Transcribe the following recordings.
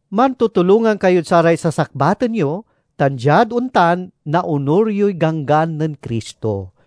Mantutulongan kayod saray sasakbaten yo, tan diad ontan naonur yoy ganggan nen Cristo.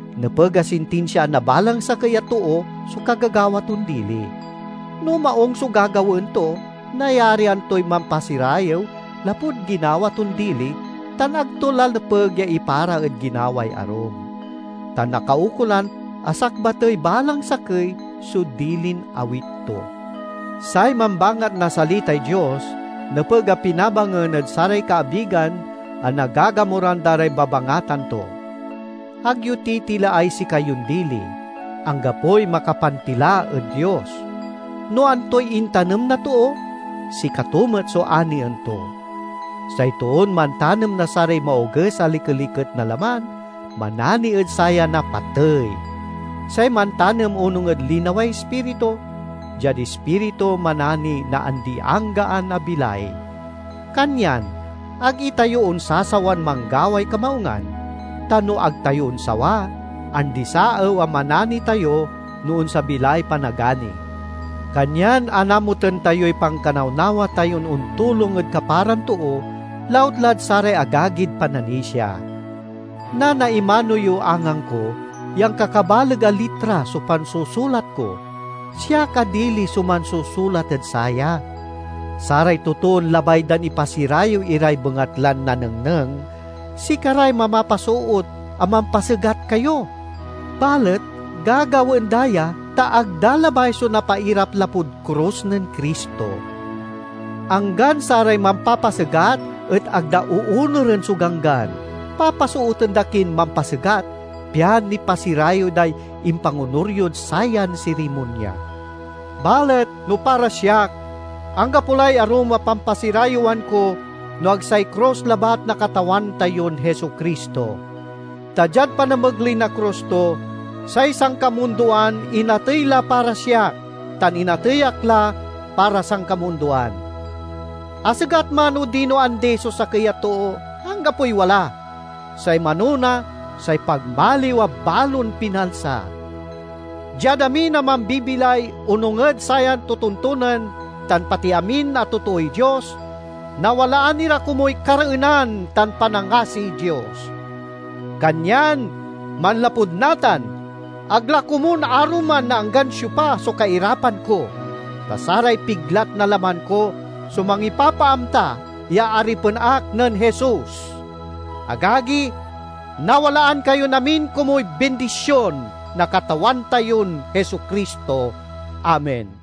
Nepeg a sintinsiaan na balang sakey a too so kagagawa ton dili. No maung so gagawaen to, nayarian toy mampasirayew lapud ginawa ton dili tan ag to la nepeg ya ipara ed ginaway arum. Ta nakaukolan a sakbatey balang sakey so dilin awit to. Say mambangat na salitay Dios nepeg a pinabangen ed saray kaabigan a nagagamuran da ray babangatan to. Ag yo titilaay sikayon dili: anggapoy makapantila ed Dios. No antoy intanem na too, sikato met so anien to. Say toon mantanem na saray maoges a likeliket na laman, manani ed saya na patey. Say mantanem onung ed linaway Ispiritu, diad Ispiritu manani na andi-anggaan a bilay. Kanyan ag itayo onsasawan manggaway kamaungan; ta no ag tayo onsawa, andi-saew a manani tayo no onsabi lay panagani. Kanyan anamuten tayoy pankanawnawa tayon ontulong ed kaparan too, lautlad saray agagid pananisia. Nanaimano yo angangko ya ankakabaleg a litra so pansusulat ko; siak a dili so mansusulat ed saya! Saray totoon labay dan ipasirayew iray bengatlan nanengneng, sikaray mamapasoot a mampasegat kayo. Balet gagawaen da ya, ta ag da labay so napairap lapud krus nen Cristo. Anggan saray mampapasegat et ag da oonuren so Ganggan; papasooten da kin mampasegat, pian nipasirayew day impangonur yod sayan sirimonya. Balet no para siak, anggapo lay arum a pampasirayewan ko no ag say krus labat na Katawan tayon Jesu-Cristo; ta diad panamegley na krus to, say sankamundoan inatey la para siak, tan inatey ak la para sankamundoan. Asegat man odino andi so sakey a too, anggapoy wala. Say manona say pagmaliw a balon pinalsa. Diad amin a mambibilay onung ed sayan totontonen, tan pati amin a totooy Dios—nawalaan ira komuy kareenan tan panangasiy Dios! Kanyan manlapud natan, ag la komun aruman na anggan siopa so kairapan ko, ta saray piglat na laman ko so mangipapaamta ya aripen ak nen Jesus. Agagi, nawalaan kayon amin komuy bindision na Katawan tayon Jesu-Cristo. Amen.